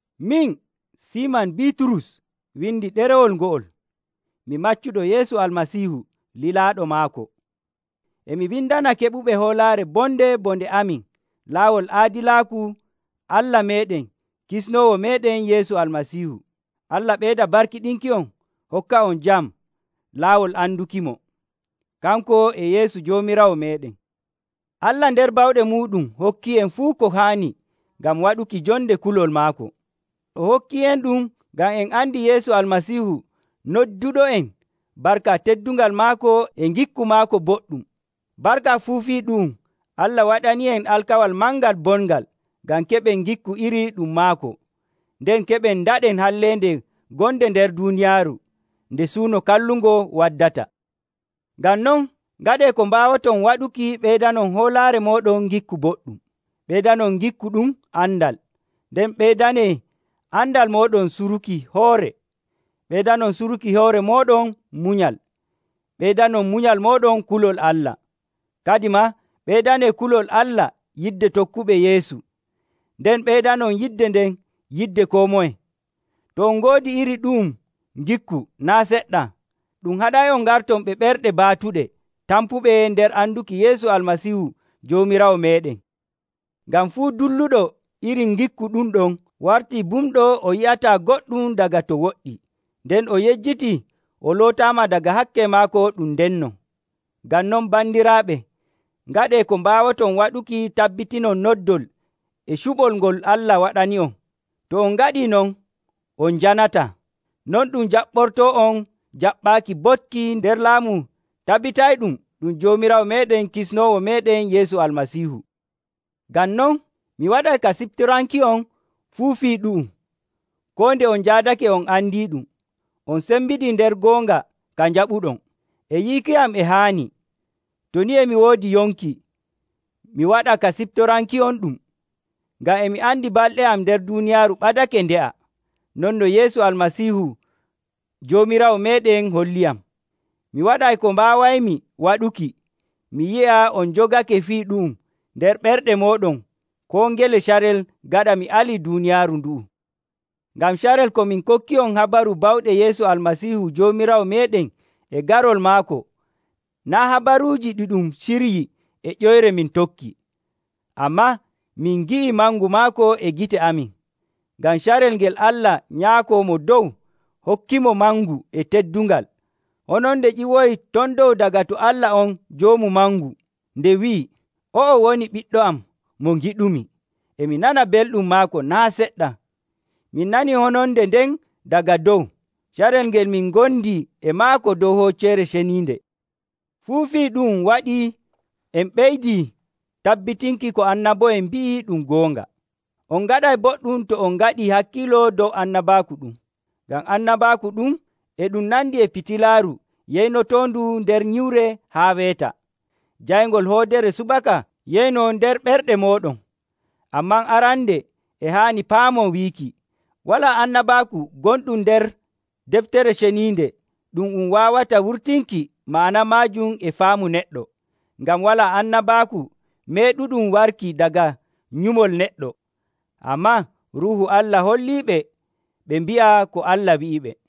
Min, Siiman Biiturus, windi ɗerewol ngo'ol. Mi maccuɗo Yeesu Almasiihu lilaaɗo maako. E mi windana keɓuɓe hoolaare bonde bo nde amin laawol aadilaaku Allah meeɗen Kisnoowo meeɗen Yeesu Almasiihu: Allah ɓeyda barkiɗinki'on hokka'on jam laawol andukimo, kanko e Yeesu Joomiraawo meeɗen. Allah nder bawɗe muuɗum hokkii'en fuu ko haani ngam waɗuki jonde kulol maako. O hokkii'enɗum ngam en andi Yeesu Almasiihu nodduɗo'en barka teddungal maako e ngikku maako boɗɗum. Barka fuu fii ɗu'um Allah waɗanii'en alkawal mangal bongal, ngam keɓen ngikku iri ɗum maako, nden keɓen ndaɗen halleende gonde nder duuniyaaru nde suuno kallungo waddata. Ngam non, ngaɗee ko mbaawoton waɗuki ɓeydanon hoolaare mooɗon ngikku boɗɗum, ɓeydanon ngikku ɗum andal. Nden ɓeydanee andal mooɗon suruki hoore, ɓeydanon suruki hoore mooɗon munyal, ɓeydanon munyal mooɗon kulol Allah. Kadimaa ɓeydanee kulol Allah yidde tokkuɓe Yeesu, nden ɓeydanon yidde nden yidde koo moye. To on ngoodi iri ɗu'um ngikku naa' seɗɗa, ɗum haɗay'on ngarton ɓe ɓerɗe baatuɗe tampuɓe nder anduki Yeesu Almasiihu Joomiraawo meeɗen. Ngam fuu dulluɗo iri ngikku ɗum ɗon wartii bumɗo o yi'ataa goɗɗum daga to woɗɗi, nden o yejjitii o lootaama daga hakke maako ɗum ndenno. Ngam non, bandiraaɓe, ngaɗee ko mbaawoton waɗuki tabbitinon noddol e cuɓol ngol Allah waɗani'on. To on ngaɗii non, on njanataa. Non ɗum jaɓɓortoo'on jaɓɓaaki boɗki nder laamu tabitayɗum ɗum Joomiraawo meeɗen Kisnoowo meeɗen Yeesu Almasiihu. Ngam non, mi waɗay ka siftoranki'on fuu fii ɗu'um, koo nde on njaadake on andiiɗum, on cembiɗii nder goonga ka njaɓuɗon. E yiiki am e haani, to ni e mi woodi yonki, mi waɗa ka siftoranki'onɗum. Ngam e mi andi balɗe am nder duuniyaaru ɓadake nde'a, non no Yeesu Almasiihu Joomiraawo meeɗen holliyam. Mi waɗay ko mbaawaymi waɗuki mi yi'a on njogake fii ɗu'um nder ɓerɗe mooɗon koo ngele carel gaɗa mi alii duuniyaaru ndu'u. Ngam carel ko min kokki'on habaru bawɗe Yeesu Almasiihu Joomiraawo meeɗen e garol maako, naa' habaruuji ɗi ɗum siryii e ƴoyre min tokki. Ammaa min ngi'ii mangu maako e gite amin. Ngam carel ngel Allah Nyaako Mo Dow hokkimo mangu e teddungal, hononde ƴiwoyii ton dow daga to Allah on Joomu Mangu nde wi'i, “O'o woni Ɓiɗɗo am mo ngiɗumi. E mi nana belɗum maako naa' seɗɗa.” Min nanii hononde nden daga dow, carel ngel min ngondi e maako dow hocceere ceniinde. Fuu fii ɗu'um waɗii en ɓeydii tabbitinki ko annabo'en mbi'i ɗum goonga. On ngaɗay boɗɗum to on ngaɗii hakkiilo dow annabaaku ɗum. Ngam annabaaku ɗum e ɗum nandi e fitilaaru yeynotoondu nder nyiwre haa weeta, jayngol hoodere subaka yeynoo nder ɓerɗe mooɗon. Ammaa arande e haani paamon wiiki, walaa annabaaku gonɗum nder Deftere Ceniinde ɗum um waawata wurtinki ma'ana maajum e faamu neɗɗo. Ngam walaa annabaaku meeɗuɗum warki daga nyumol neɗɗo. Ammaa Ruuhu Allah holliɓe ɓe mbi'a ko Allah wi'iɓe.